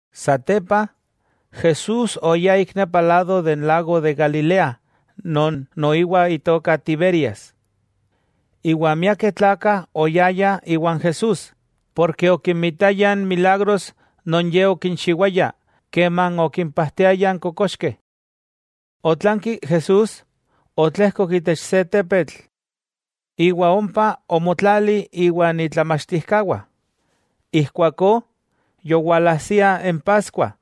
Satepa, Jesús oyá ik nepa lado de lago de Galilea non noiwa itoka Tiberias. Iwa miakeh tlakah oyayah iwan Jesús, porke okinmitayah n milagros non Ye okinchiwaya keman okimpajtiaya n kokoxkeh. Otlanki Jesús otlejkok itech se tepetl iwa ompa omotlali iwan itlamachtijkawah. Ijkuakó yowalajsia n paskua,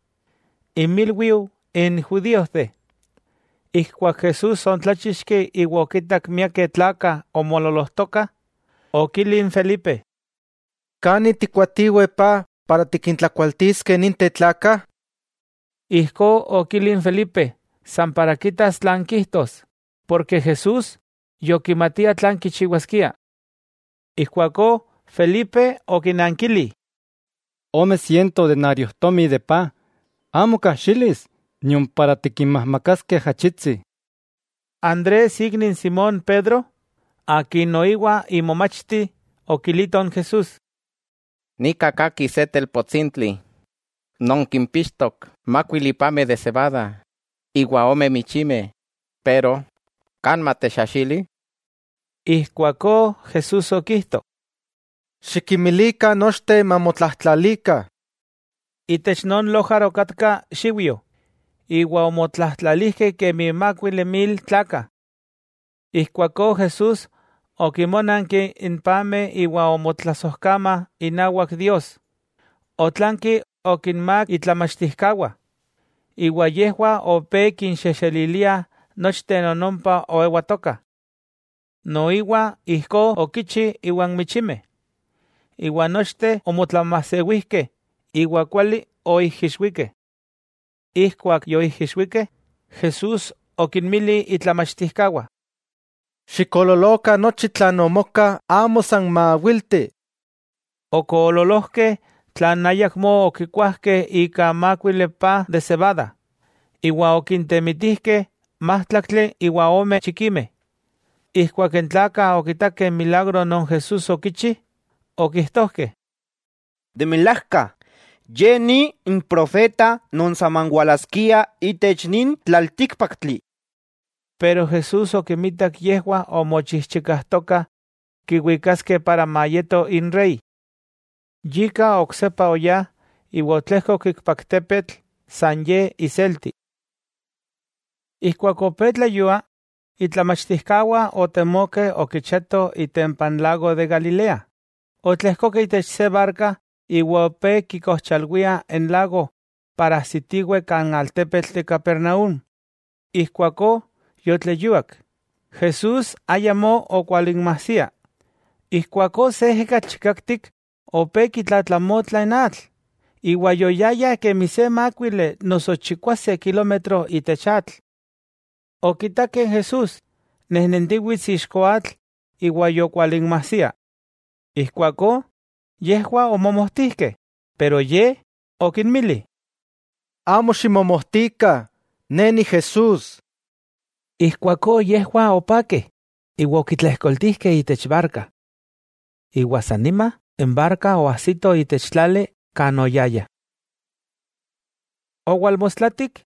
inmilwiu n judíojteh. Ijkuak Jesús oontláchixki iwa okitak miakeh tlakah omoololojtokah, okili n Felipe: —¿Kani tikkoatiweh paj para tikintlakualtiskeh ninteh tlakah? Ijkó okili n Felipe san para kitas tlan kijtos, porke Jesús yokimatia tlan kichiwaskia. Ijkuakó Felipe okinankili: —¡Ome siento denariojtomi paj, amo kajxilis tikinmajmakaskeh ajachitsi! Andrés ikni n Simón Pedro, akin noiwa imomachti okilito n Jesús: —Nika kajki se telpotsintli, non kimpixtok mákuili pameh de sebada iwa ome michimeh, pero ¿kan matechajxili? Ijkuakó Jesús okijto: —Xikinmilikah nochteh mamotlajtlalikah. Itech non lojar okatka xiujyo, iwa omotlajtlalijkeh kemi mákuili mil tlakah. Ijkuakó Jesús okinmónanki n pameh iwa omotlasojkama inawak Dios, otlanki okinmák itlamachtijkawah, iwa yejwah opé kinxejxeliliah nochteh non ompa oewatokah. Noiwa ijkó okichi iwan michimeh, iwa nochteh omotlamajsewijkeh iwa kuali oijixwikeh. Ijkuak yoijixwikeh, Jesús okinmili itlamachtijkawah: —Xikoololokah nochi tlan omoka amo san maawilti. Okoololojkeh tlan ayakmó okikuajkeh ika mákuili paj de sebada, iwa okintemitijkeh májtlaktli iwa ome chikimeh. Ijkuak n tlakah okitakeh n milagro non Jesús okichi, okijtojkeh: —De milajka, Ye ni n profeta non saman walaskia itech nin tlaltíkpaktli. Pero Jesús okinmitak yejwah omochijchikajtokah kiwikaskeh para mayeto Inrey. Yika, oksepa oyá iwa otlejkok ikpak tepetl san Ye iselti. Ijkuak opé tleyua, itlamachtijkawah otemokeh okichiatoh itempa n lago de Galilea. Otlejkokeh itech se barka iwa opé kikojchalwiah n lago para ajsitiweh kan altepetl de Capernaúm. Ijkuakó yotleyuak, Jesús ayamó okwalinmajsia. Ijkuakó se ejekatl chikaktik opé kitlatlamotla n atl. Iwa yoyayah kemi se mákuili noso chikwase kilómetro itech atl. Okitakeh n Jesús nejnentiwits ixko atl iwa yokualinmasia. Ijkuakó yejwah omomojtijkeh, pero Ye okinmili: —Amo ximomojtikah, Ne ni Jesús. Ijkuakó yejwah opakeh iwa okitlejkoltijkeh itech barka. Iwa san nima n barka oajsito itech tlali kan oyayah. Owalmostlatik,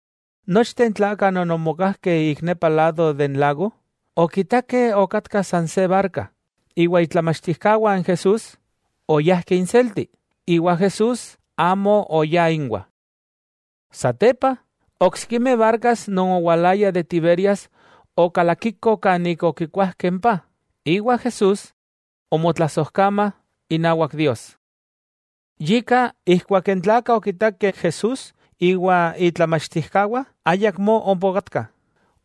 nochteh n tlakah non omokajkeh ik nepa lado de n lago, okitakeh okatka san se barka, iwa itlamachtijkawah n Jesús oyajkeh inselti, iwa Jesús amo oya inwah. Satepa, oksikimeh barkas non owalaya de Tiberias okalakikoh kan ik okikuajkeh n paj, iwa Jesús omotlasojkamah inawak Dios. Yika, ijkuak n tlakah okitakeh Jesús iwa itlamachtijkawah ayakmó ompa okatkah,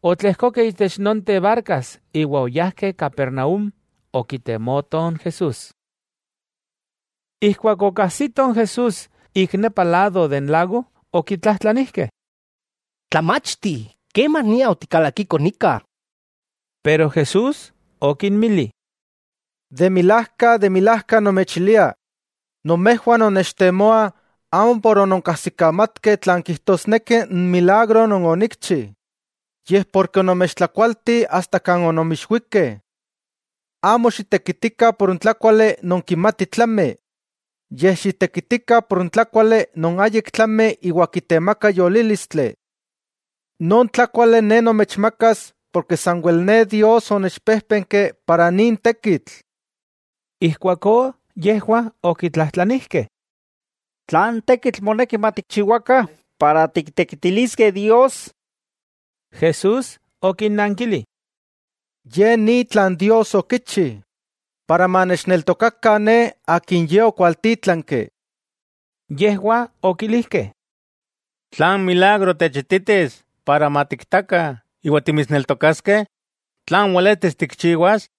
otletlejkokeh itech nonteh barkas iwa oyajkeh Capernaúm okitemoto n Jesús. Ijkuak okajsitoh n Jesús ik nepa lado de n lago, okitlajtlanijkeh: —Tlamachti, ¿kemania otikalakiko nika? Jesús okinmili: —De milajka, de milajka nomechilia, nomejwah nonnechtemoah amo por ononkajsikamatkeh tlan kijtosneki n milagro non onikchi, yej porke onomechtlakualti asta kan ononmijixwikeh. Amo xitekitikah por n tlákuali non kimati tlami, yej xitekitikah por n tlákuali non ayik tlami iwa kitemaka yolílistli. Non tlákuali Ne nomechmakas porke sanwel Ne Dios onechpéjpenki para nin tekitl. Ijkuakó yejwah okitlajtlanijkeh: —¿Tlan tekitl moneki matikchiwakah para tiktekitiliskeh Dios? Jesús okinnankili: —Ye ni tlan Dios okichi, iwa manechneltokakah Ne Akin Ye okualtítlanki. Yejwah okilijkeh: —¿Tlan milagro techititis para matiktakah iwa timitsneltokaskeh? ¿Tlan weletis tikchiwas?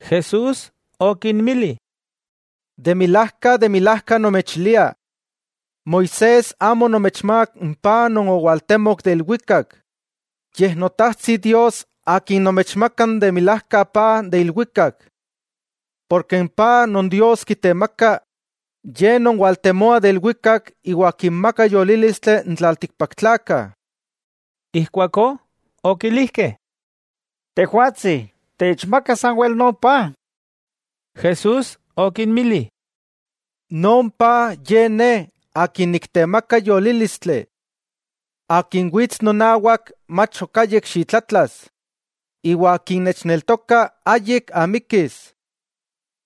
Jesús okinmili: —De milajka, de milajka nomechilia: Moisés amo onomechmák n paj non owaltemok de ilwikak, yej Notajtsi Dios Akin nomechmaka n de milajka paj de ilwikak. Porke n paj non Dios kitemaka ye non waltemoa de ilwikak iwa kinmaka yolílistli n tlaltikpaktlakah. Ijkuakó okilijkeh: —Tejwatsi, techmaka sanwel non paj. Jesús okinmili: —Non paj ye Ne, akin niktemaka yolílistli. Akin wits nonawak mach ok ayik xitlatlas, iwa akin nechneltoka ayik amikis.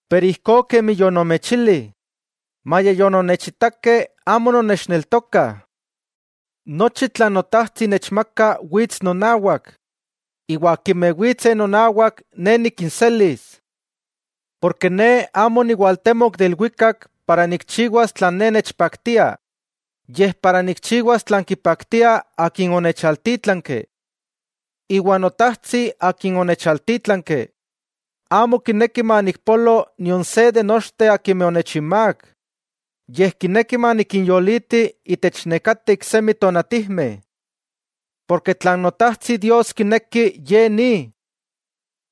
Pero ijkó kemi yonomechili, maya yononnechitakeh amo nonnechneltokah. Nochi tlan Notajtsi nechmaka wits nonawak, iwa akimeh witseh nonawak, Ne nikinselis. Porke Ne amo oniwaltemok de ilwikak para nikchiwas tlan Ne nechpaktia, yej para nikchiwas tlan kipaktia Akin onechaltítlanki. Iwa Notajtsi Akin onechaltítlanki, amo kineki manikpolo nion se de nochteh akimeh onechinmák, yej kineki manikinyoliti itech nekateh iksemi tonatijmeh. Porke tlan Notajtsi Dios kineki Ye ni: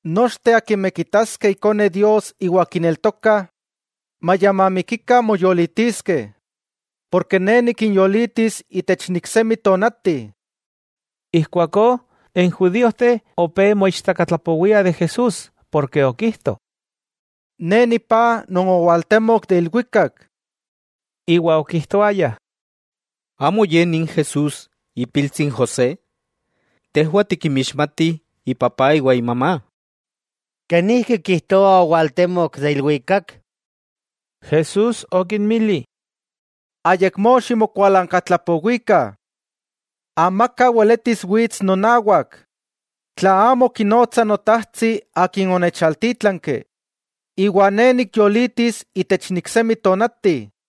nochteh akimeh kitaskeh Ikone Dios iwa kineltokah, maya mamikikah moyolitiskeh porke Ne nikinyolitis itech n iksemi tonati. Ijkuakó n judíojteh opé moichtakatlapowiah de Jesús porke okijto: “Ne nipaj non owaltemok de ilwikak.” Iwa okijtoayah: —¿Amo ye nin Jesús, ipiltsi n José? Tejwah tikinmixmatih ipapá iwa imamá. ¿Kenijki kijtoa owaltemok de ilwikak? Jesús okinmili: —Ayakmó ximokualankatlapowikah. Amaka weletis wits nonawak, tla amo kinotsa Notajtsi Akin onechaltítlanki, iwa Ne nikyolitis itech n iksemi tonati.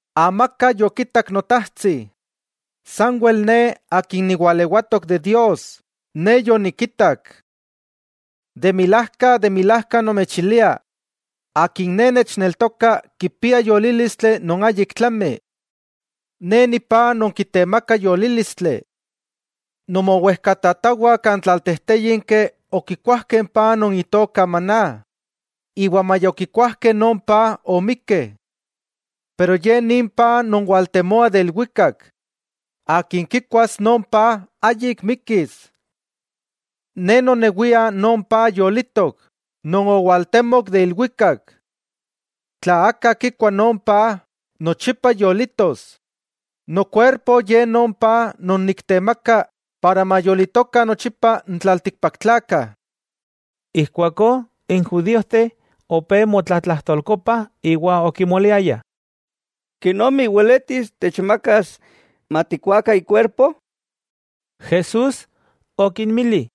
'Amaka yokitak Notajtsi, sanwel Ne Akin niwalewatok de Dios, Ne yonikitak. De milajka, de milajka nomechilia: Akin Ne nechneltoka kipia yolílistli non ayik tlami. Ne ni paj non kitemaka yolílistli. Nomowejkatatawah kan tlaltejtéyinki okikuajkeh n paj non itoka maná, iwa maya okikuajkeh non paj omikeh. Pero Ye nin paj non waltemoa de ilwikak, akin kikuas non paj, ayik mikis. Ne nonewia non paj yolitok non owaltemok de ilwikak. Tla aka kikua non paj, nochipa yolitos. Nokuerpo ye non paj non niktemaka para mayolitokah nochipa n tlaltikpaktlakah. Ijkuakó n judíojteh opé motlatlajtolkopah iwa okimoliayah: —¿Kenomi weletis techmakas matikkuakah ikuerpo? Jesús okinmili: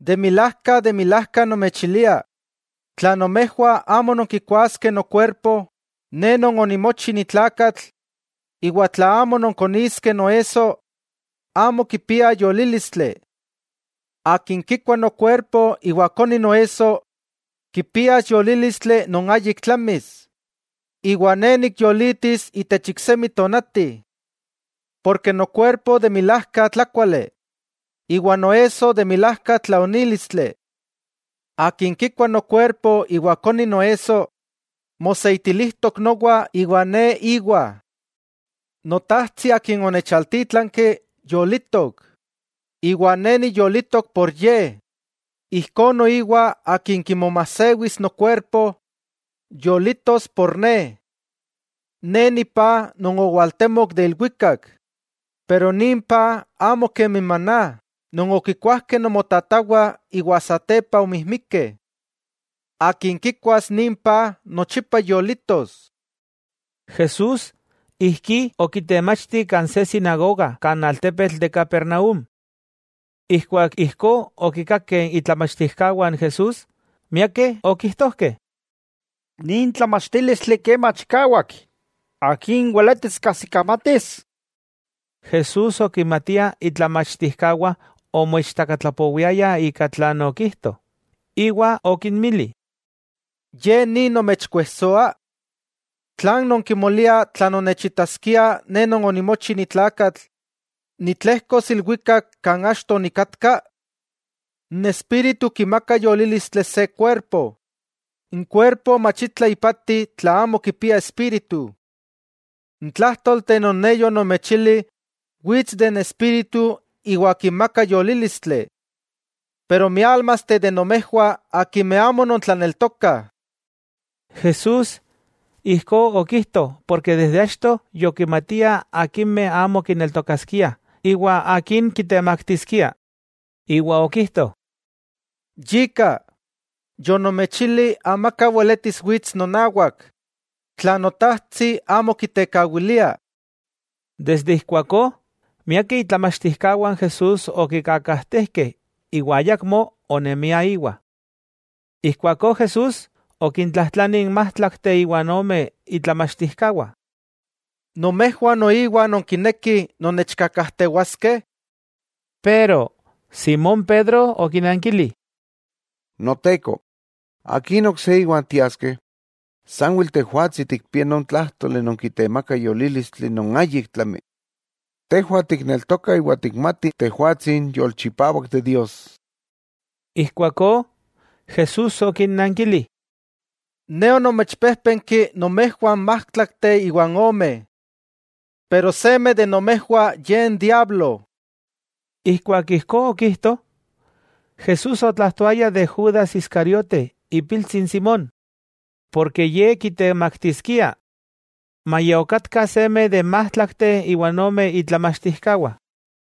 —De milajka, de milajka nomechilia: Tla nomejwah amo nonkikuaskeh nokuerpo, Ne non onimochi ni tlakatl, iwa tla amo nonkoniskeh noesso, amo kipiah yolílistli. Akin kikua nokuerpo iwa koni noesso kipias yolílistli non ayik tlamis, iwa Ne nikyolitis itech iksemi tonati. Porke nokuerpo de milajka tlákuali, iwa noesso de milajka tlaonílistli. Akin kikua nokuerpo iwa koni noesso, moseitilijtok nowa iwa Ne íwa. Notajtsi Akin onechaltítlanki, yolitok, iwa Ne niyolitok por Ye, ijkó noiwa akin kimomajsewis nokueqrpo, yolitos por Ne. Ne Ni paj non owaltemok de ilwikak, pero nin paj amo kemi n maná non okikuajkeh nomotatawah iwa satepa omijmikeh. Akin kikuas nin paj, nochipa yolitos. Jesús ijkí okitemachti kan se sinagoga kan altepetl de Capernaúm. Ijkuak ijkó okikakeh itlamachtijkawah n Jesús, miakeh okijtojkeh: —Nin tlamachtílistli kema chikawak, ¿akin weletis kajsikamatis? Jesús okimatia itlamachtijkawah omoichtakatlapowiayah ika tlan okijto, iwa okinmili: —¿Ye ni nomechkuejsoa? ¿Tlan nonkimoliah tla nonnechitaskiah Ne Non onimochi ni tlakatl nitlejkos ilwikak kan achto onikatka? N espíritu kimaka yolílistli se kuerpo. N kuerpo mach itla ipati tla amo kipia espíritu. N tlájtolteh non Ne yonomechili wits de n espíritu iwa kimaka yolílistli. Pero miálmasteh nomejwah akimeh amo nontlaneltokah. Jesús ijkó okijto porke desde achto yokimatia akimeh amo kineltokaskiah iwa akin kitemaktiskia. Iwa okijto: —Yika, yonomechili amaka weletis wits nonawak, tla Notajtsi amo kitekawilia. Ika noni, miakeh itlamachtijkawah n Jesús okikakajtejkeh iwa ayakmó onemiah íwa. Ijkuakó Jesús okintlajtlani n májtlakteh iwa ome itlamachtijkawah: —¿Nomejwah noiwa nonkinekih non nechkakajtewaskeh? Simón Pedro okinankili: —Noteko, ¿Akin ok se íwa tiaskeh? Sanwel Tejwatsi tikpia non tlájtoli non kitemaka yolílistli non ayik tlami. Tejwah tikneltokah iwa tikmatih Tejwatsi n Yolchipawak de Dios. Ijkuakó Jesús okinnankili: —Ne onomechpéjpenki nomejwah n májtlakteh iwan ome. Pero seme de nomejwah ye n diablo. Ijkuak ijkó okijto, Jesús otlajtoaya de Judas Iscariote ipiltsi n Simón, porke ye kitemaktiskia maya okatka seme de n májtlakteh iwa ome itlamachtijkawah.